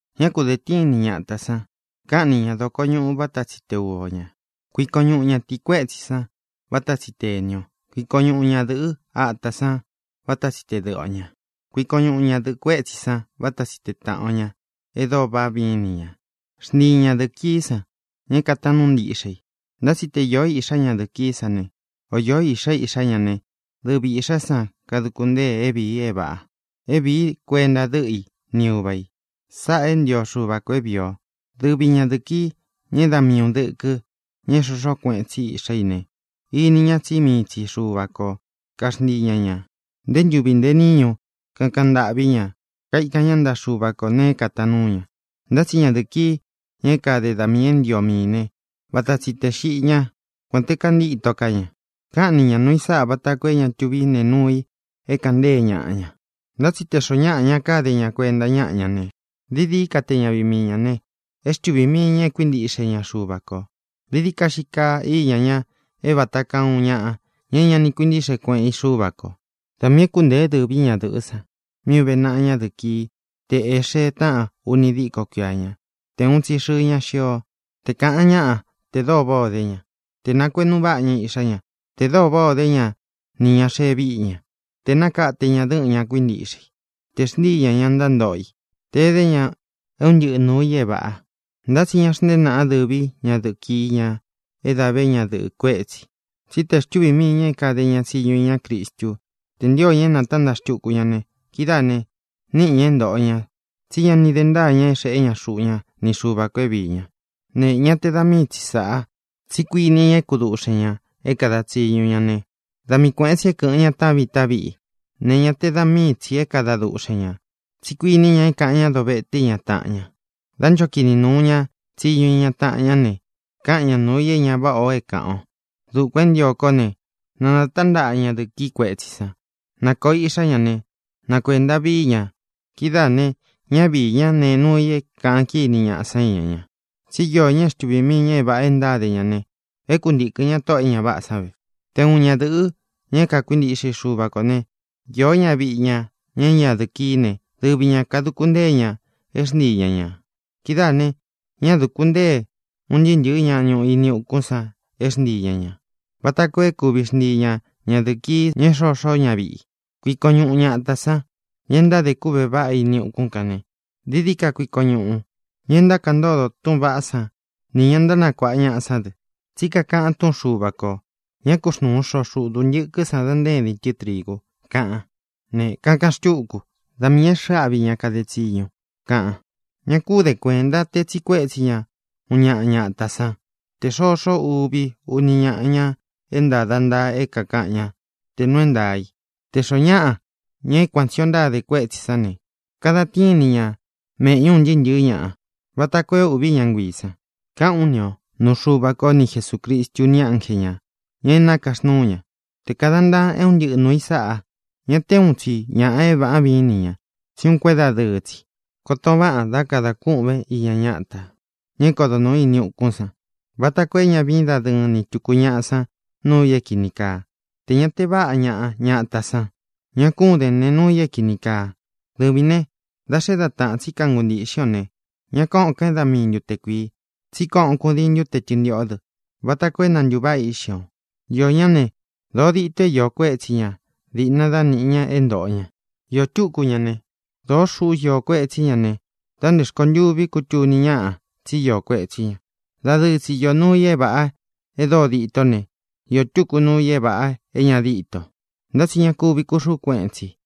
Ñá ku dēn tíin ni ñatā san. Káꞌan ni ña dokoñuꞌu vata tsi te uva o ñā. Kuikon ñuꞌun ñatii kuetsī sán vata tsi te ēni o. Kuikon ñuꞌun ñadɨ̄ꞌɨ́ ata san vata tsi te dɨꞌɨ o ñā. Kuikon ñuꞌun ñadɨ̄ꞌɨ kuétsi san váta tsi te tāꞌan o ña e dóo váꞌa viín ni ñā. Xntiin ñadɨ̄ꞌɨ kií san, ña é kātaan núu ntiꞌxe i. Ntá tsi te īó iꞌxá ñadɨ̄ꞌɨ kií san ne, o īó iꞌxa iꞌxá ña ne, dɨvi īꞌxá san kaduku ntée é vīi é vāꞌa, é vīí kuenta dɨ́ꞌɨ i ni uva ī. Sáꞌā é ntio Xuva kō é vīi o. Dɨvi ñadɨ̄ꞌɨ kií, ña é da mii un dɨkɨ, ña é xoxó kueꞌen tsi iꞌxá i ne, ini ña tsí mii tsi Xuva ko kaxntii ña ñā. Nté ntuvi ntē níñu kakaꞌan ntâꞌví ña, kaikan ñá ntaꞌa Xuva ko nēe é kātaan núu ña. Ntá tsi ñadɨ̄ꞌɨ kií, ña é kade da miī é ntio miī né, vata tsi tē xiꞌi ñá, kuān te kantíto ká ña. Káꞌan ni ña nūu i sáꞌa vata koo é ña tuví nee nuu i é kāꞌan ntée ñaꞌa ña. Ntá tsi te xoó ñaꞌa ña kade ña kuenta ñáꞌa ña ne, dií dií ka te ñaviꞌi mii ñā ne, é xtuvī mii ña e kuíntiꞌxe ña Xuva kō. Dií dií ka xii kaa íña ña é vata kaa uun ñaꞌa, ña é ña ni kuintíꞌxe kueꞌen í Xuva kō. Da miī é kuntēé dɨ̄ví ñadɨ̄ꞌɨ́ san mí uve naꞌa ñadɨ̄ꞌɨ kií tē é xee táꞌan uni díko kuia ña, te uun tsi xɨɨ ña xio, te kāꞌan ñáꞌa te dóo váꞌā o dé ña, tē nakueꞌnu váꞌa ña iꞌxá ña, tē dóo váꞌā o dé ña nī ña xee víꞌi ña, tē e nákate ña dɨ́ꞌɨn ña kuíntiꞌxe i, tē e xntíi ñā ña ntántoꞌo i, tē edé ña é uun ntɨꞌɨ nuū i é vāꞌa. Ntá tsi ña xntéen naꞌan dɨ̄ví ñadɨ̄ꞌɨ kií, ña é dā vé ñadɨ̄ꞌɨ kuétsī, tsí te xtuvī mii ña é kāde tsiñu ña iñá Cristú tē ntio ña é nātántaꞌa xtuku ña ne, kidáā ne, níꞌi ña é ntōꞌo ña tsí ña ni de ntáa ña é xeꞌé ña xuꞌu ña ni Xuva kō é viī ña. Ne, ñá te da mii tsi sāꞌa, tsí kuiní ña é kuduꞌxen ñā é kāda tsiñu ña ne, da mii kuēꞌen tsi é kɨ̄ꞌɨn ña taꞌán viꞌi taꞌán viꞌi. Ne, ñá te da mii tsī é kada duꞌxen ñā, tsí kuiní ña é kāꞌan ñá dovete iña taꞌan ña. Dá ncho kini nūu ña tsiñu iña taꞌan ñá ne, káꞌan ña nūu i é ña váꞌā o é kāꞌan o. Dukuān é ntio kó ne, na nātántaꞌa ñadɨ̄ꞌɨ kií kuetsī san. Na kōo iꞌxá ña ne, na kuēnta víi ña viꞌi ña. Kidáā ne, ñá viī ñá nēe nuu i é kāꞌan kíni ñaꞌa san íña ña. Tsí iō ña é xtuvī mii ña é vāꞌa e ntáde ña ne, é kuntīkɨn ña tóꞌō e ña váꞌā san ve. Te uun ñadɨ̄ꞌɨ́, ña é kakuintiꞌxe i Xuva kō né, īó ñaviꞌi ña, ña é ñadɨ̄ꞌɨ kií ne, dɨvi ñā kaduku ntée ña é xntii ña ñā. Kidáā ne, ñá dūku ntee un ntɨɨ́ ntɨ̄ɨ́ ña ñuꞌu ini ukún san é xntii ña ñā, vata koo é kuvi xntii ña ñadɨ̄ꞌɨ kií, ña é xoxó ñaviꞌi i. Kuikon ñuꞌun ñatā san, ña e ntádē kúꞌvē vaꞌá ini ukún kān ne, dií dií ka kuikon ñuꞌun ña e ntákaꞌan ntódo túꞌūn vaꞌá san nī ña ntánakuāꞌa ñaꞌa sán dɨ. Tsí kakaꞌan túꞌun Xuva kō: “Ña ku xnúun xoꞌo xuꞌu dūntɨkɨ́ san da ntaédín tɨ trigu”, kaꞌan. Ne, kakaꞌan xtúku: “Da miī é xɨ̄ꞌɨ áꞌvi ña kade tsiñu”, kaꞌan. Ña kún den kuēnta te tsiꞌi kuétsi ñaꞌa uun ñaꞌa ñatā sán tē xoxó uvi, uni ñaꞌa, ña é ntāda ntaa é kākaꞌan ñá te nuu é ntaā i. Tē xoó ñaꞌa, ña é kuan tsī o ntáde kuétsī sán ne, kadan tíin ni ña mēꞌñu un ntɨɨ́ ntɨ̄ɨ́ ñaꞌa, vata koo é ūꞌví ña nguiī san. Káꞌān ú ni o nuu Xuva ko ni Jesūcristu ni ánje ñā, ña é nakaxnúu ña, te kādan ntaan é un ntɨꞌɨ nūu i sáꞌa. Ña te úun tsi ñāꞌa é vāꞌá viin ni ñā, tsí uun kuédadɨɨ́ tsi. Koton váꞌān dá kadān kûꞌvén iña ñátā, ña é kodo nūu ini ukún san, vata koo é ña viín dadɨɨn ni tūku ñaꞌa san núu ī é kini kaa, tē ña te váꞌa ñaꞌa ñatā san. Ña kún den nēe nuu i é kīni kaa. Dɨvīn ne, da xé da taꞌan tsi kanguntii īꞌxí o ne, ña kóꞌōn kán e dá mii ntute kuīi, tsí koꞌon kudiin ntute tɨ́ntiꞌó dɨ vata koo é na ntūváꞌa íꞌxi ō. Iō ñáꞌa ne, dōo dito é iō kuetsí ña diꞌna dá nīꞌi ña é ntōꞌo ña. Iō túku ñaꞌa ne, dōó xuꞌu íō kuetsí ña ne, da nté rkontûví kutuni ñáꞌa tsí iō kuetsí ña. Dadɨɨ tsi īó nuu i é vāꞌa e dóo ditó ne, īó tuku nuu i é vāꞌa é ña díto, ntá tsi ña kuvi kuxuꞌú kueꞌen tsi.